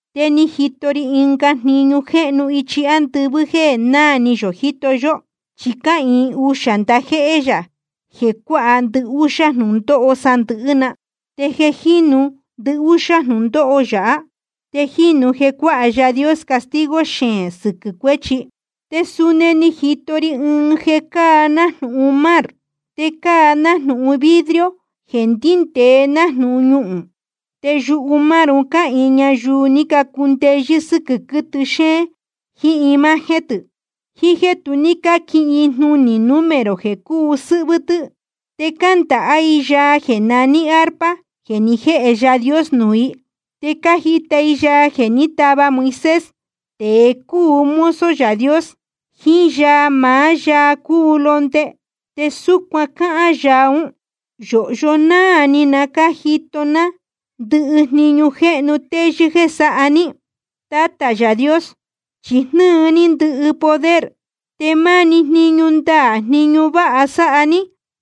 Te ni jito ri ɨnga jniñu jéhnu ichi ándɨvɨ́ jéē náā ni yō jíto yó. Chi cáhīin uxā ndajéhé yā jeē cuāha ndɨhúxá jnūndóho sandɨ̄hɨ́ na. Te jeē jínu ndɨhúxá jnūndóho yáha, te jīnu jeē cuáha Yaā Dios castigo xeēn sɨquɨ̄ cuéchi. Te suni ni jito ri ɨɨn jeē cáa nájnūhun mar, te cáa nájnūhun vidrio jeē ndíndēe nájnūhun ñuhūn. Te yumar un cáhīin ñayuu ni cacundeyɨ́ sɨ́quɨ̄ quɨtɨ xéén jiín imagen tɨ̄, jiín jéē tu ní cáquihin i jnunī número jeē cúu sɨ́hvɨ́ tɨ́. Te cándāhá i yaa jeē naní arpa jeē ni jéhe Yaā Dios nuū i. Te cájita i yaa jeē ní tava Moisés, tēe cúu mozo Yaā Dios, jiín yaa maá Yaā cúu Londe. Te súcuan cáhán yaa ún: Yōhyo náā ni na cájito ná ndɨhɨ jniñu jéhnu teyɨ́ jéē sáha ní, Tátā Yaā Dios, chi jnɨ́ɨ ní ndɨhɨ poder. Te máni jniñu ndaā jniñu váha sáha ní,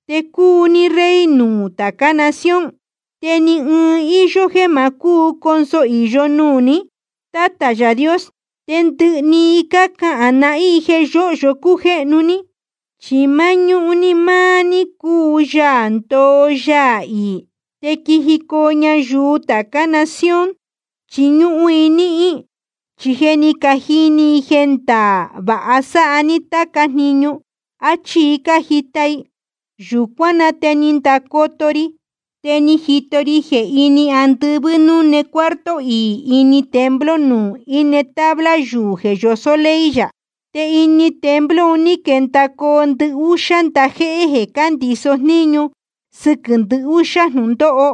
jeē cúu ní Rey nuū tācá nación. Tú ni ɨɨn i íyó jéē ma cónso īyo i nuū ní, Tátā Yaā Dios. Te ndɨhɨ i cahān nahín i jeē yóhyo cújéhnu ní. Chi máñúhún ni máá ní cúu Yaā ndoo Yaā iī. Te quijicoo ñayuu tācá nación, chiñúhún i níhín, chi je ni cajini i jeē ndaā vāha sáha ní táca jniñu. Achí i cájita i. Yūcuán na te ni ndacoto ri, te ni jito ri jeē ini andɨvɨ́ núne cuarto iī ini templo nuū íne tabla yuū jeē yosó ley yā. Te ini templo un ní quendacoo ndɨhúxá ndajéhé jeē cándiso jníñu sɨquɨ̄ ndɨhúxá jnūndóho.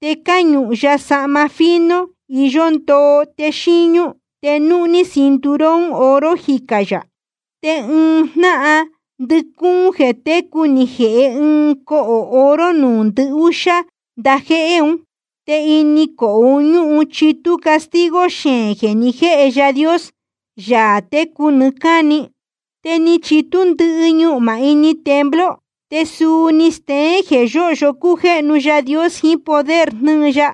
Te cáñuhun ya sahma fino iyó ndoo te xíñú. Te núhní cinturón oro jicā yā. Te ɨɨn jnáhan ndɨcúún jeē técu ni jēhe ɨɨn ɨɨn cohō oro nuū ndɨhúxá ndajéhé un. Te ini cohō un ñúhun chitú castigo xeēn jeē ni jéhe Yaā Dios, Yaā técu nɨɨ́ cáni. Te ni chitú ndɨ́ɨ̄ ñuhmā ini templo, te suu ni steén jeē yóhyo cújéhnu Yaā Dios jiín poder jnɨ́ɨ ya.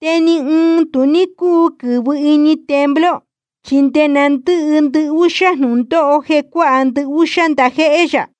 Te ni ɨɨn tu ní cúu quɨ̄vɨ ini templo, chi nde na ndɨ́hɨ ndɨhúxá jnūndóho jeē cuáha ndɨhúxá ndajéhé yā.